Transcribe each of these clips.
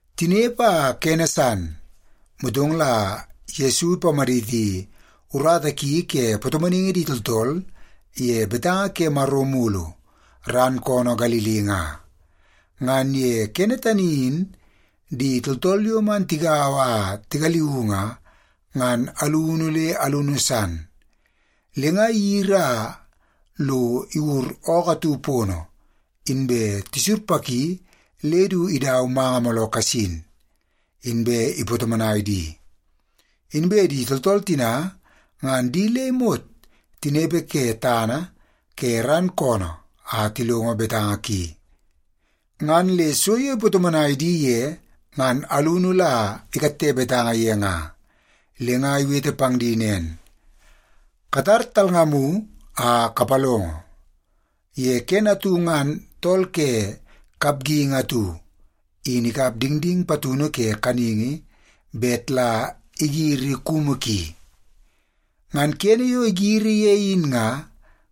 Tinepe a kene san, motong la Yesu ipamaditi urata ki ke patomonaingi di tooltool ye betanga ke Maro mulu ran koonoo Galili nga. Ngan ye kene tani in di tooltool yo man tigaua a tigaliuu nga, ngan alunu le alunu san. Le nga iyiri a lo iwur ookoo atu pono, inbe tisurpaki le du idau manga mooloo kasin, inbe ipatomonai di. Inbe di tooltool tina, ngan di le imot tinepe ke tana ke ran koonoo a tilongo betanga ki. Ngan le so yo ipatomonai di ye, ngan alunu la ikatte betanga ye nga. Le nga iwete pang di nen, “Katar talngamu a kapalongo! Ye kene atu ngan tool ke kapgingi atu in ikap dingding patunu ke kaningi bet la igiri kumu ki. Ngan kene yo igiri ye in nga,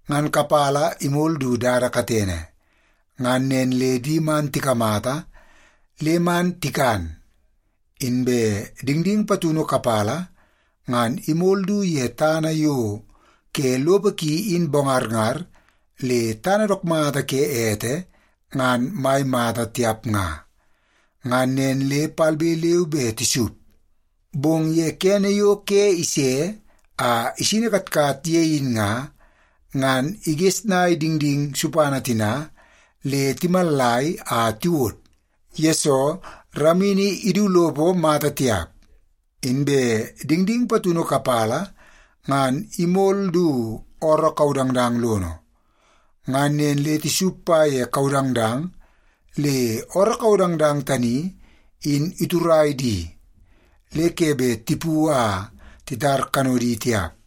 ngan kapala imol du dada katene. Ngan nen le di man tikamata le man tikan. Inbe dingding patunu kapala ngan imol du ye tana yo ke lopo ki in bongarngar le tana dook mata ke ete ngan mai mata tiap nga. Ngan nen le palbe leu be tisup, bong ye kene yo ke ise a isini katkat ye in nga, ngan igesnai dingding supana tina le timallai a tiwod, yesoo ramini idu lopo mata tiap. Inbe dingding patunu kapala ngan imol du ooroo kaudangdang lono. Ngan nen le tisup pa ye kaudangdang le ooroo kaudangdang tani in iturai di le ke bet tipu a titar kanodi tiap.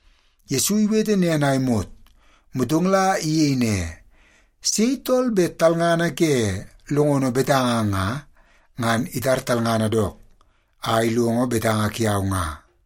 Yesu iwete nen a imot, motong la iyei ne, “Sei tool bet talngana ke longono betanga nga, ngan itar talngana dook a ilongo betanga kiau nga.”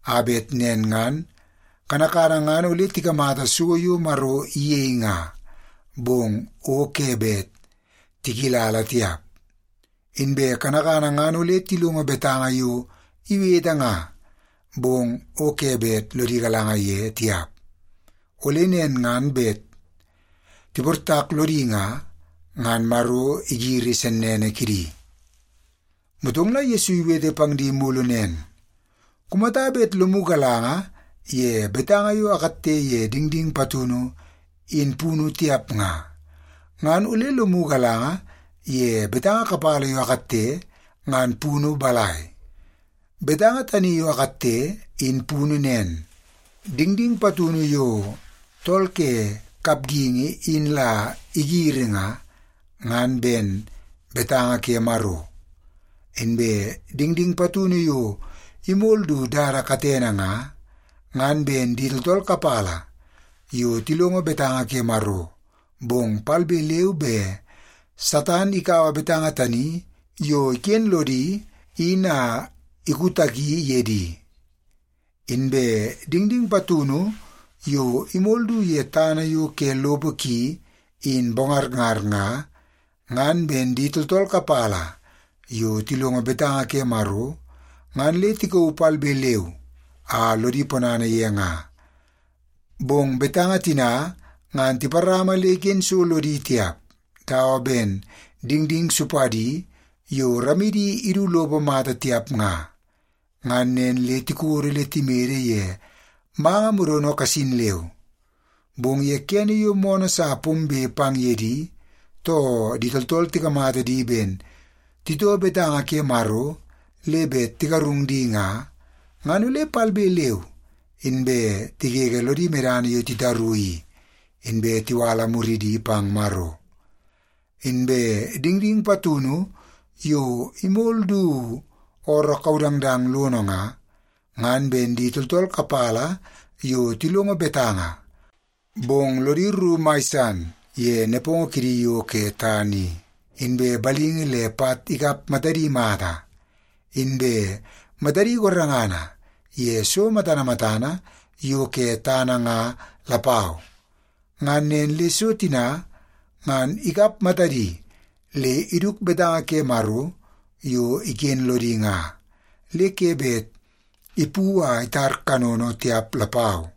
a bet nen ngan, ‘kanakana ngan ole tikamata so yo Maro iyei nga, bong o ke bet tikilala tiap. Inbe kanakana ngan ole tilongo betanga yo iwete nga, bong o ke bet lodi galanga ye tiap, ole nen ngan bet tiportak lodi nga, ngan Maro igiri sennene kidi!’” Motong la Yesu iwete pang di mulu nen, “Kumata bet lomu galanga ye betanga yo akatte ye dingding patunu in punu tiap nga, ngan ole lomu galanga ye betanga kapala yo akatte ngan punu balai? Betanga tani yo akatte in punu nen. Dingding patunu yo tool ke kapgingi in la igiri nga, ngan ben betanga ke Maro. Inbe dingding patunu yo imol du dada katene nga, ngan ben di tooltool kapala yo tilongo betanga ke Maro, bong palbe leu be Satan ikaua betanga tani yo iken lodi in a ikutaki ye di. Inbe dingding patunu yo imol du ye tana yo ke lopo ki in bongarngar nga, ngan ben di tooltool kapala yo tilongo betanga ke Maro ngan le tikauu palbe leu a lodi ponana ye nga. Bong betanga tina ngan tiparama le iken so lodi tiap dawa ben dingding supadi yo ramidi idu lopo mata tiap nga. Ngan nen le tikodo le timede ye manga modono kasin leu. Bong ye kene yo moonoo sa pombe pang ye di, too di tooltool tikamata di ben titoo betanga ke Maro le bet tigarung di nga, ngan ole palbe leu inbe tigege lodi medana yo titaru i, inbe tiwala muridi pang Maro. Inbe dingding patunu yo imol du ooroo kaudangdang lono nga, ngan ben di tooltool kapala yo tilongo betanga, bong lodi rru mai san ye nepongo kidi yo ke tana i, inbe balingi le pat ikap matadi mata, inbe matadi gorengana ye so matana matana yo ke tana nga lapau. Ngan nen le so tina ngan ikap matadi le iduk betanga ke Maro yo iken lodi nga, le ke bet ipu a itar kanono tiap lapau.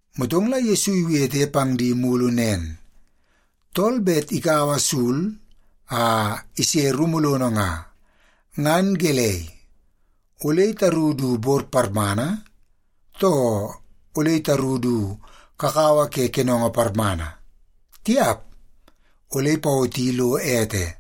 Motong la Yesu iwete pang di mulu nen, “Tool bet ikaua sul a ise rumu lono nga, ngan gelei, ole itaru du bor parmana, too ole itaru du kakawa ke kenongo parmana? Tiap! Ole ipawoti lo ete.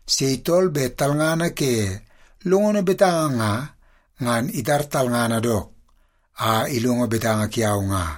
Sei tool bet talngana ke longono betanga nga, ngan itar talngana dook a ilongo betanga kiau nga.”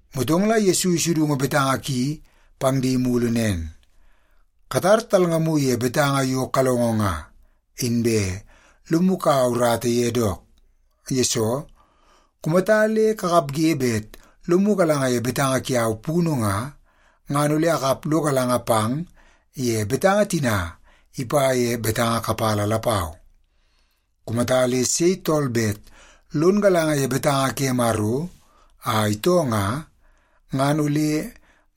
Motong la Yesu isudungu betanga ki pang di mulu nen, “Katar talngamu ye betanga yo kalongo nga, inbe lomu kaua urata ye dook. Yesoo, kumata le kakapge bet lomu galanga ye betanga kiau punu nga, ngan ole akap lo galanga pang ye betanga tina ipa ye betanga kapala lapau. Kumata le sei tool bet lon galanga ye betanga ke Maro a itoo nga, ngan ole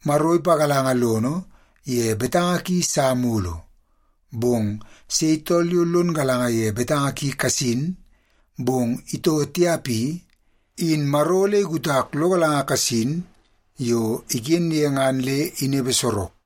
Maro ipagalanga lono ye betanga ki sa mulu. Bong sei tool yo lon galanga ye betanga ki kasin, bong itoo tiap i, in Maro ole ikutak lo galanga kasin yo iken ye ngan le inepe sorok.”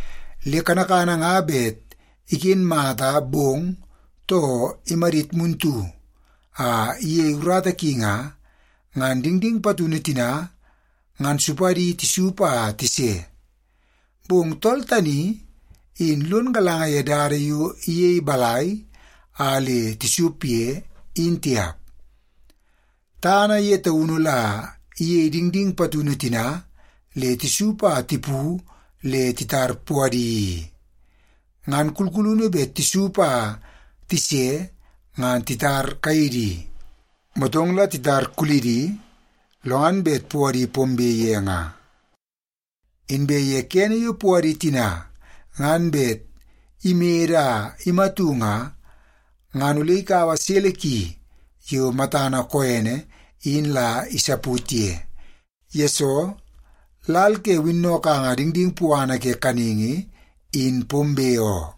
Le kanakana nga bet iken mata bong, too imadit muntu a iyei urata ki nga, ngan dingding patunu tina ngan supadi tisup a tise. Bong tool tani in lon galanga ye dada yo iyei balai a le tisup ye, in tiap. Tana ye taunu la iyei dingding patunu tina le tisup a tipu le titar puadi i. Ngan kulkulunu bet tisup a tise ngan titar kaidi, motong la titar kuludi, lo ngan bet puadi pombe ye nga. Inbe ye kene yo puadi tina ngan bet imede a imatu nga, ngan ole ikaua sele ki yo matana koene in la isaput ye. Yesoo, lal ke winnokanga dingding puana ke kaningi in pombe oo.”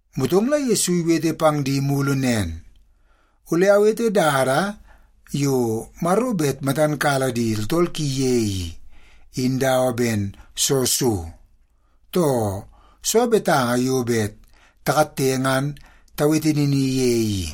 Motong la Yesu iwete pang di mulu nen, “Ole tawete dada yo Maro bet matan kala di tooltool ki ye i, in dawa ben soo so? Too, soo betanga yo bet takatte ngan tawete nini ye i?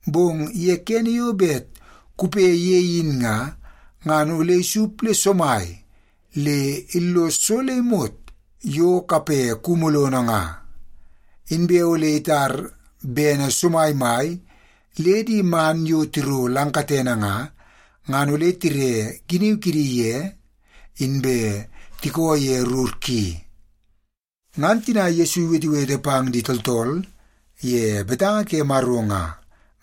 Bong ye kene yo bet kupe ye in nga, ngan ole isup le somai le illos so le imot yo kape kumu lono nga. Inbe ole lo itar bene somaimai le di man yo tiro lang katene nga, ngan ole tire giniu kidi ye inbe tiko ye rur ki.” Ngan tina Yesu iwetewete pang di tooltool ye betanga ke Maro nga,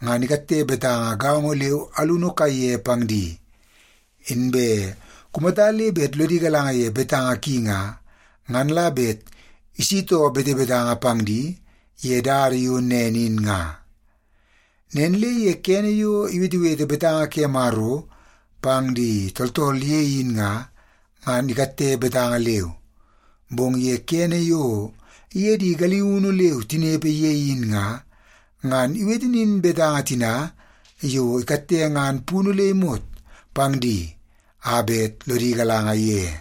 ngan ikatte betanga gaongo leu alunu kaiye pang di. Inbe kumata le bet lodi galanga ye betanga ki nga, ngan la bet isitoo betebetanga pang di ye dada yo nen in nga. Nen le ye kene yo iwetewete betanga ke Maro pang di tooltool ye in nga, ngan ikatte betanga leu. Bong ye kene yo iye di galiunu leu tinepe ye in nga, ngan iwete nin betanga tina yo ikatte ngan punu le imot pang di a bet lodi galanga ye.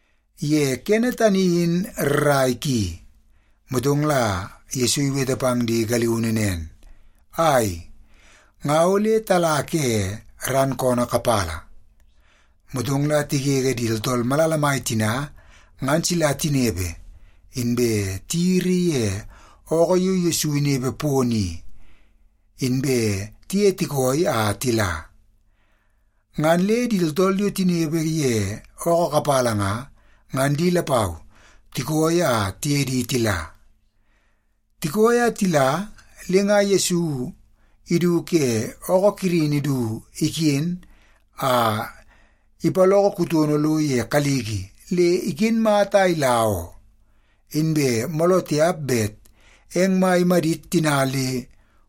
Ye kene tani in rrai ki, motong la Yesu iwete pang di galiunu nen, “Ai, nga ole tala ke ran koonoo kapala.” Motong la tigege di tooltool malala mai tina ngan sila tinepe, inbe tiyiri ye ookoo yo Yesu inepe pono i, inbe tiye tikooi a tila. Ngan le di tooltool yo tinepe ye ookoo kapala nga, ngan di lapau tikooi a tiye di tila. Tikooi a tila, le nga Yesu idu ke ookoo kirini du iken a ipaloko kutono lo ye kaliki le iken mata a ila oo, inbe mooloo tiap bet eng mai imadit tina le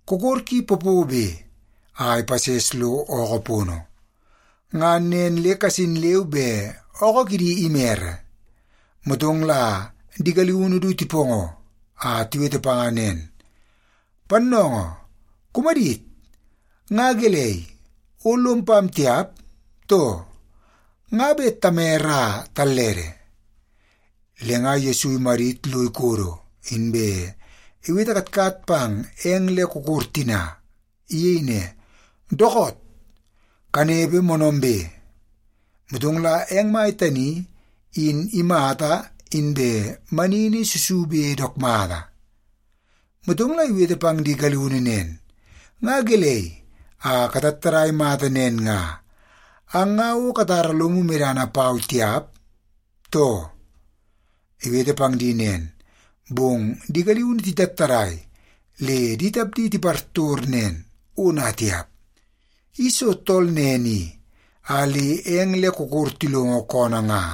kokor ki popobe a ipases lo ookoo pono. Ngan nen le kasin leu be ookoo kidi imere. Motong la di galiunu du tipoongoo a tiwete panga nen, “Pannoongoo, kumadit! Nga gelei, o lom pam tiap, too? Nga bet tamere a tallede!” Le nga Yesu imadit lo ikodo, inbe iwete katkat pang eng le kokor tina. Iyei ne, “Dookoot! Kanepe moonoombe!” Motong la eng mai tani in imata inbe manini susube dook mata. Motong la iwete pang di galiunu nen, “Nga gelei a katattadai mata nen nga? Ang nga o katara lomu medana pau tiap, too?” Iwete pang di nen, bong di galiunu titattadai le di tapdi tipartor nen, “Ona tiap! I soo tool nen i a le eng le kokor tilongo koonoo nga?”